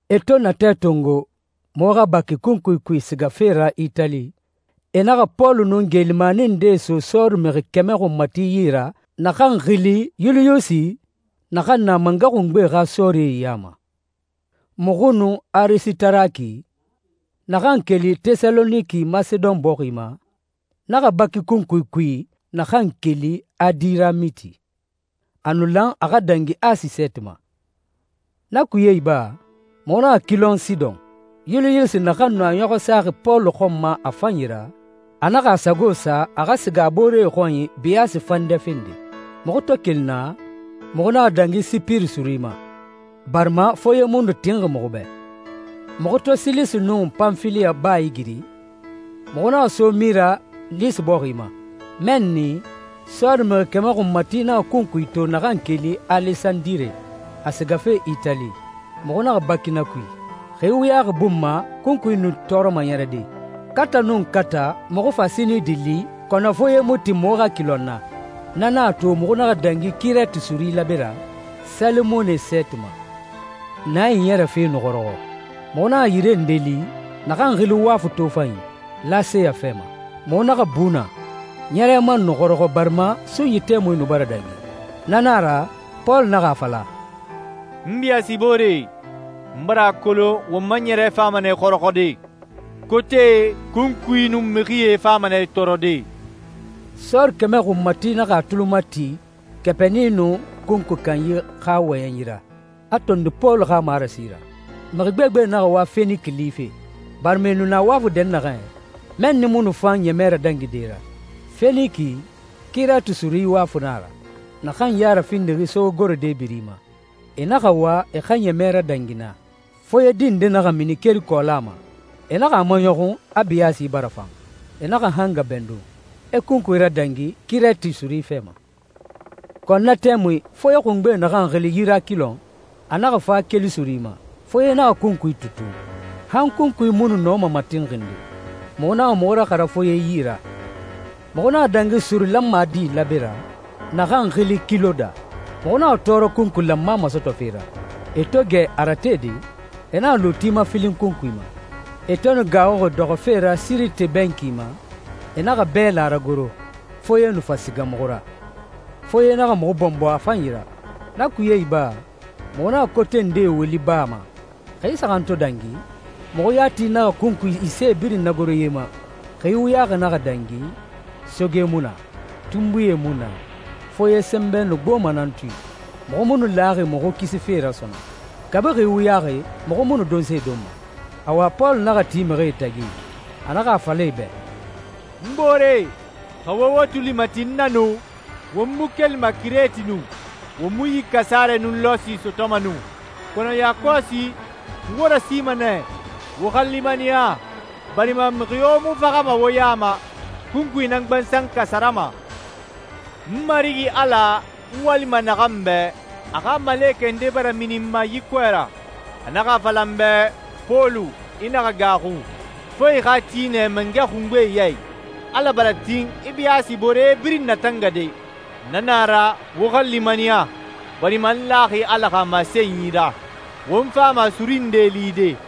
E to natɛ tongo muxu xa baki kunkui kui sigafe ra Itali, e naxa Pɔlu nun geelimani ndee so sɔɔri mixi kɛmɛ xunmati yi ra naxan xili Yuliyusi, naxan na mangɛ xungbe xa sɔɔrie ya ma. Muxu nun Arisitaraki, naxan keli Tɛsaloniki Masedon bɔxi ma, naxa baki kunkui kui naxan keli Adiramiti. A nu lan a xa dangi Asi sɛɛti ma. Na kuye iba, muxu naxa kilɔn Sidɔn. Yuliyusi, naxan nu a ɲɔxɔ saxi Pɔlu xɔn ma a fanyi ra, a naxa a sago sa a xa siga a booree xɔnyi biyaasi fandɛ fende. Muxu to keli naa, muxu naxa dangi Sipiri suri ma, barima foye mu nu tinxi muxu bɛ. Muxu to Silisi nun Panfiliya baa igiri, muxu naxa so Mira, Lisi bɔxi ma. Mɛnni, sɔɔri mixi kɛmɛ xunmati naxa kunkui to naxan keli Alesandire, a sigafe Itali. Muxu naxa baki na kui. Xi wuyaxi bun ma kunkui nu tɔɔrɔma ɲɛrɛde. Kata nun kata muxu fa Sinidi li kɔnɔ foye mu tin muxu xa kilɔn naa. Na nan a to muxu naxa dangi Kirɛti suri laabe ra, Salemone sɛɛti ma. Naa iɲɛrɛfe nu xɔrɔxɔ. Muxu naxa yire nde li, naxan xili Wafu Tofanyi, Laseya fɛ ma. Muxu naxa bu naa. Ɲɛrɛ man nu xɔrɔxɔ barima sunyi tɛmui nu bara dangi. Na na a ra, Pɔlu naxa a fala, «N biyaasibooree, n bara a kolon won ma ɲɛrɛ fama nɛ xɔrɔxɔde. Kotee, kunkui, nun mixie fama nɛ tɔɔrɔde.» Sɔɔri kɛmɛ xunmati naxa a tuli mati kɛpini nun kunkui kanyi xa wɔyɛnyi ra, a tondi Pɔlu xa marasi ra. Mixi gbegbe naxa wa Feniki life, barima e nu na wafu dɛnnaxɛ, mɛnni mu nu fan ɲɛmɛ radangide ra. Feniki, Kirɛti suri wafu nan a ra, naxan ya rafindixi sogegorode biri ma. E naxa wa e xa ɲɛmɛ radangi naa. Foye di nde naxa mini keli kɔɔla ma. E naxa a maɲɔxun a biyaasi bara fan. E naxa hanga bɛndun, e kunkui radangi Kirɛti suri fɛ ma. Kɔnɔ na tɛmui foye xungbe, naxan xili Yurakilɔn, a naxa fa keli suri ma. Foye naxa kunkui tutun, han kunkui mu nu nɔma matinxinde. Muxu naxa muxu raxara foye yi ra. Muxu naxa dangi suri lanmadi laabe ra, naxan xili Kiloda. Muxu naxa tɔɔrɔ kunkui lanma masɔtɔfe ra. E to gɛ a ratede, e naxa luuti mafilin kunkui ma. E to nu gaaxuxi dɔxɔfe ra Sirite bɛnki ma, e naxa bɛla ragoro, foye nu fa siga muxu ra. Foye naxa muxu bɔnbɔ a fanyi ra. Na kuye iba, muxu naxa kote nde woli baa ma. Xi saxan to dangi, muxu yati naxa kunkui isee birin nagoro ye ma. Xi wuyaxi naxa dangi, soge mu na, tunbuie mu na, foye sɛnbɛ nu gboma nan tui. Muxu mu nu laxi muxu kisife ra sɔnɔn. Kabi xi wuyaxi muxu mu nu donse donma. Awa Pɔlu naxa ti mixie tagi, a naxa a fala e bɛ, «N booree, xa wo wo tuli mati n na nu, won mu kelima Kirɛti nu, won mu yi kasarɛ nun lɔsi sɔtɔma nu. Kɔnɔ yakɔsi, n wo rasima nɛ, wo xa limaniya, barima mixi yo mu faxama wo ya ma, kunkui nan gbansan kasarama. N Marigi Ala, n walima naxan bɛ, a xa malekɛ nde bara mini n ma yi kɔɛ ra. A naxa a fala n bɛ, ‹Pɔlu, i naxa gaaxu, fo i xa ti nɛ mangɛ xungbe ya i. Ala bara tin i biyaasiboore birin natangade.› Na na a ra, wo xa limaniya barima n laxi Ala xa masenyi ra. Won fama suri nde lide.»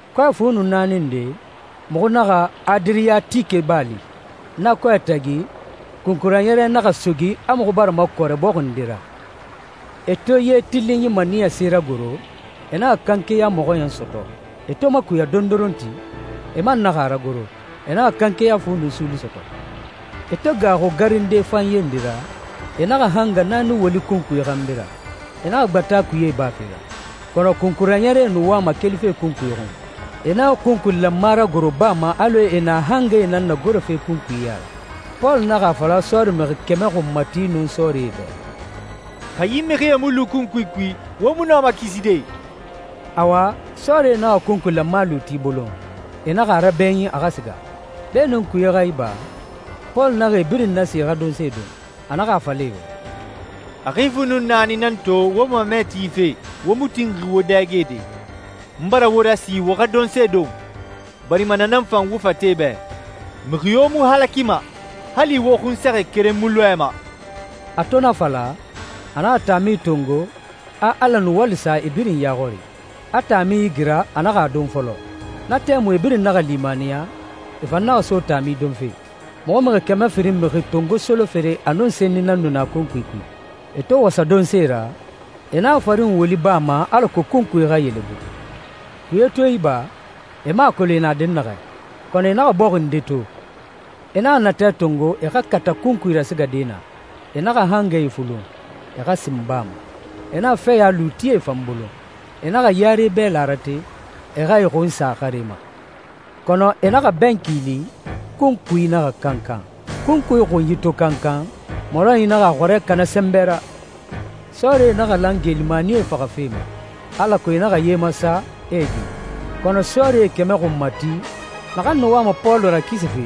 Kɔɛ fu nun naani nde, muxu naxa Adiriyatike baa li. Na kɔɛ tagi kunkui raɲɛrɛ naxa sogi a muxu bara makɔrɛ bɔxi nde ra. E to ye tilinyi maniyase ragoro, e naxa kanke ya mɔxɔɲɛn sɔtɔ. E to makuya dondoronti, e man naxa a ragoro, e naxa kanke ya fu nun suuli sɔtɔ. E to gaaxu garinde fanye nde ra, e naxa hanga naani woli kunkui xanbi ra. E naxa gbata kuye ibafe ra. Kɔnɔ kunkui raɲɛrɛe nu wama kelife kunkui xun. E naxa kunkui lanma ragoro baa ma alɔ e na hangae nan nagorofe kunkui ya ra. Pɔlu naxa a fala sɔɔri mixi kɛmɛ xunmati nun sɔɔrie bɛ, «Xa yi mixie mu lu kunkui kui, wo mu nɔma kiside.» Awa, sɔɔrie naxa kunkui lanma luuti bolon, e naxa a rabɛɲin a xa siga. Beenun kuye xa iba, Pɔlu naxa e birin nasi e xa donse don. A naxa a fala e bɛ, «A xi fu nun naani nan to wo mamɛ tife, wo mu tinxi wo dɛgede. N bara wo rasi wo xa donse don, barima na nan fan wo fate bɛ. Mixi yo mu halakima, hali wo xunsɛxɛ keren mu lɔɛma.» A to na fala, a naxa taami tongo, a Ala nuwali sa e birin ya xɔri, a taami igira, a naxa a don fɔlɔ. Na tɛmui e birin naxa limaniya, e fan naxa so taami donfe. Muxu mixi kɛmɛ firin mixi tongo solofere a nun senni nan nu na kunkui kui. E to wasa donse ra, e naxa farin woli baa ma alako kunkui xa yelebu. Kuye to iba, e mu a kolon e na dɛnnaxɛ, kɔnɔ e naxa bɔxi nde to. E naxa natɛ tongo e xa kata kunkui rasigade naa. E naxa hangae fulun, e xa sin baa ma. E naxa fɛya luutie fan bolon. E naxa yare bɛla rate, e xa e xun sa xare ma. Kɔnɔ e naxa bɛnki li, kunkui naxa kankan. Kunkui xunyi to kankan, mɔrɔnyi naxa a xɔrɛ kana sɛnbɛ ra. Sɔɔrie naxa lan geelimanie faxafe ma, alako e naxa ye masa, e e gi. Kɔnɔ sɔɔrie kɛmɛ xunmati, naxan nu wama Pɔlu rakisife,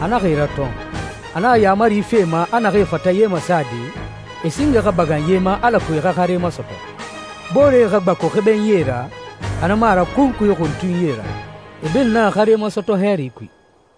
a naxa e ratɔn. A naxa yaamari fi e ma a naxee fata ye masade, e singe xa bagan ye ma alako e xa xare masɔtɔ. Booree xa gbaku xebenyie ra, xa na mu a ra kunkui xuntunyie ra. E birin naxa xare masɔtɔ hɛɛri kui.